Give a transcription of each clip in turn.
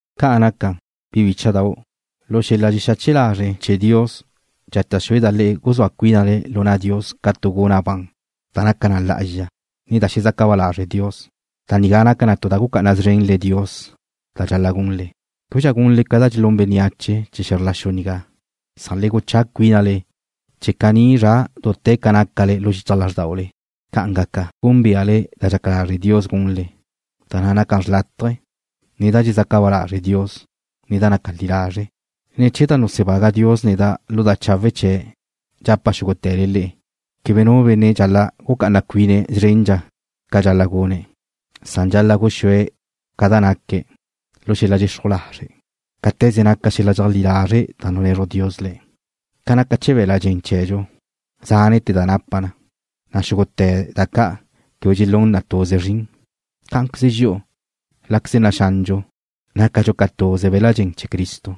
Ca'an naca, bi bícha'dau', lu xel-la dxexache lazre' chee̱ Dios, dxata' xúeda' le'e guzúa cuínale lu na' Dios ca tu guna' ban, da naca na lá'azxa, ne da xezaca ba lazre' Dios. Da nigá naca na tu da gucá'ana szrene Dios da dxal-la' gunle. Québedxa gunle ca dxelún bénneache chee̱ xe̱zr la xu nigá, san le guchá cuínale chee̱ caní zra dute̱ ca naca lu xichaj lázrdaule. Ca'an gaca, gúnbeale da dxaca lazre' Dios gunle, da na' naca xrlátaje, ne da dxezaca ba lazre' Dios, ne da naca na li lazre'. Ne̱ chee̱ da nusebaga Dios neda' lu da chawe' chee̱' dxapa' xúgute̱le le'e quebe nu benne' dxal-la' gucá'ana cuine̱' szrendxa ca dxal-la' gune̱', san dxal-la' guxúe̱' ca da naque̱' lu xel-la dxexruj lazre', cáte̱ze naca xel-la dxeajlí lazre' da nunezruj Dios le̱'. Ca naca chee̱ be̱l-la' dxen chee̱dxu, zánete̱ da napa na, na' xúgute̱ da ca' quebe dxelún na tuze zrin, cá'anqueze dxi'u, láqueze naxandxu, nácadxu ca tuze be̱l-la' dxen chee̱ Cristo,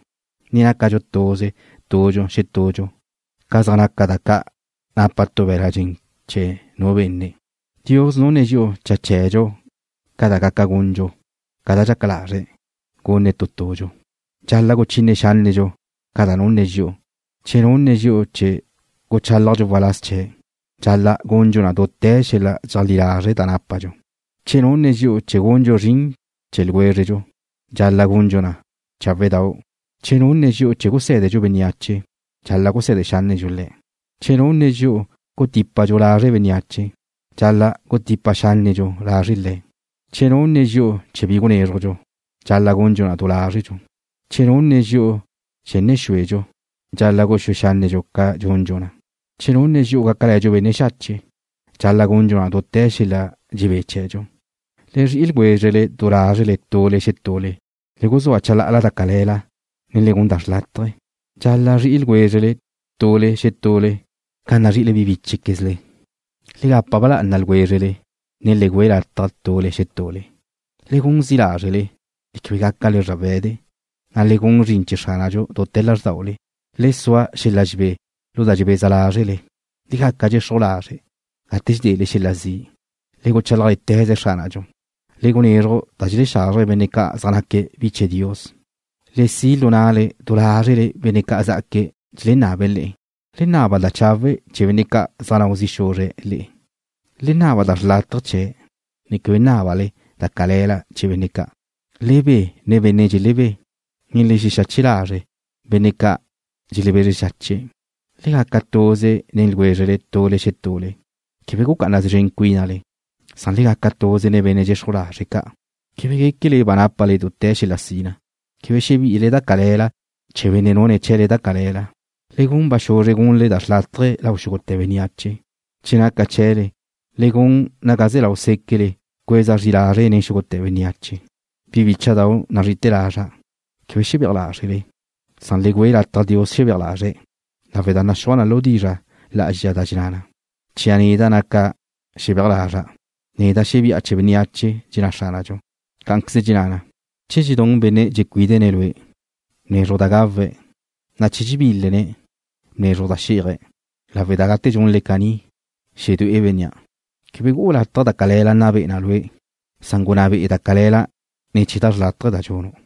ne nácadxu tuze tudxu xetudxu ca zaj naca da ca' napa tu be̱l-la' dxen chee̱ nu benne'. Dios nunne̱' dxi'u cha chee̱dxu ca da gaca gundxu ca da dxaca lazre̱' gunne̱' tu tudxu. Dxal-la' guchine xánnedxu ca da nunne̱' dxi'u. Che nunne̱' dxi'u chee̱ guchálajdxu waláz chee̱', dxal-la' gundxu na dute̱ xel-la dxeajlí lazre' da nápadxu. Che nunne̱' dxi'u chee̱ gundxu zrin chee̱ ljwézredxu, dxal-la' gundxu na cháwe'dau'. Che nunne̱' dxi'u chee̱ gusé̱dedxu bénneache, dxal-la' guse̱de xánnedxu le̱'. Che nunne̱' dxi'u chee̱ gutípadxu lazre' bénneache, dxal-la' gutipa xánnedxu lazre' le̱'. Che nunne̱' dxi'u chee̱ bi gunézrujdxu, dxal-la' gundxu na du lázredxu. Che nunne̱' dxi'u chee̱ nne̱ xuedxu, dxal-la' guxúe xánnedxu ca dxundxu na. Che nunne̱' dxi'u gácale̱dxu benne' xache' ca', dxal-la' gundxu na dute̱ xel-la dxebé chee̱dxu. Le zri'i ljwézrele du lázrele tule xetule. Le guzúa chalá'ala da cale̱la, ne le gun da xrlátaje. Dxal-la' zri'i ljwézrele tule xetule ca nazri'ile bi bíchequezle. Le gapa ba lá'ana ljwézrele, ne le güe lataj tule xetule. Le gun zi' lázrele, ne quebe gácale zrawe̱de, na' le gun zrin chee̱ Xránadxu dute̱ lázrdaule. Le sua xel-la dxebé lu da dxebeza lázrele. Le gaca dxexruj lazre' gate dxedele xel-la zi'. Le guchálajle̱teze Xránadxu. Le gunezruj da dxelexazrje benne' ca' zaj naque̱' bi chee̱ Dios. Le si' lu na'le du lázrele benne' ca' zá'aque̱' dxelenabe̱' le'e. Le naba da chawe' chee̱ benne' ca' zaj nau zi' xuzre̱' le'e. Le naba da xrlátaje chee̱', ne quebe nábale da cale̱la chee̱ benne' ca'. Le be nen benne' dxelebé, ne le xexache lazre' benne' ca' dxelebezre xache̱'. Le gaca tuze nen ljwézrele tule xetule. Quebe gucá'ana szren cuínale, san le gaca tuze nen benne' dxexruj lazre' ca'. Quebe guéquele ba nápale dute̱ xel-la sina. Quebe xebi'ile da cale̱la chee̱ benne' nune̱' chee̱le da cale̱la. Le gun ba xuzre gunle da xrlátaje lau xúgute̱ bénneache. Che naca chee̱le, le gun naga ze̱ lau séquele cueza zri lázrele nen xúgute̱ bénneache. Bi bícha'dau' nazri'ite̱ lazra', quebe xebéaj lázrele, san le güe lataj Dios xebéaj lazre̱', lawe' da naxúaj lu dizra' lá'azxa da dxenná na: Chia' neda' naca xebéaj lazra'. “Neda' xebi'a chee̱ bénneache,” dxenná Xránadxu. Cá'anqueze dxenná na: Che dxedún benne' dxecuídene̱' lue', bnezruj da gawe̱', na' che dxebílene̱', bnezruj da xí'aje̱', lawe' da gate dxunle caní, xedué'e bénnea'. Quebe gu'u lataj da cale̱la nna be'e na lue', san gunná be'e da cale̱la ne̱ chee̱ da xrlátaje da dxunu'.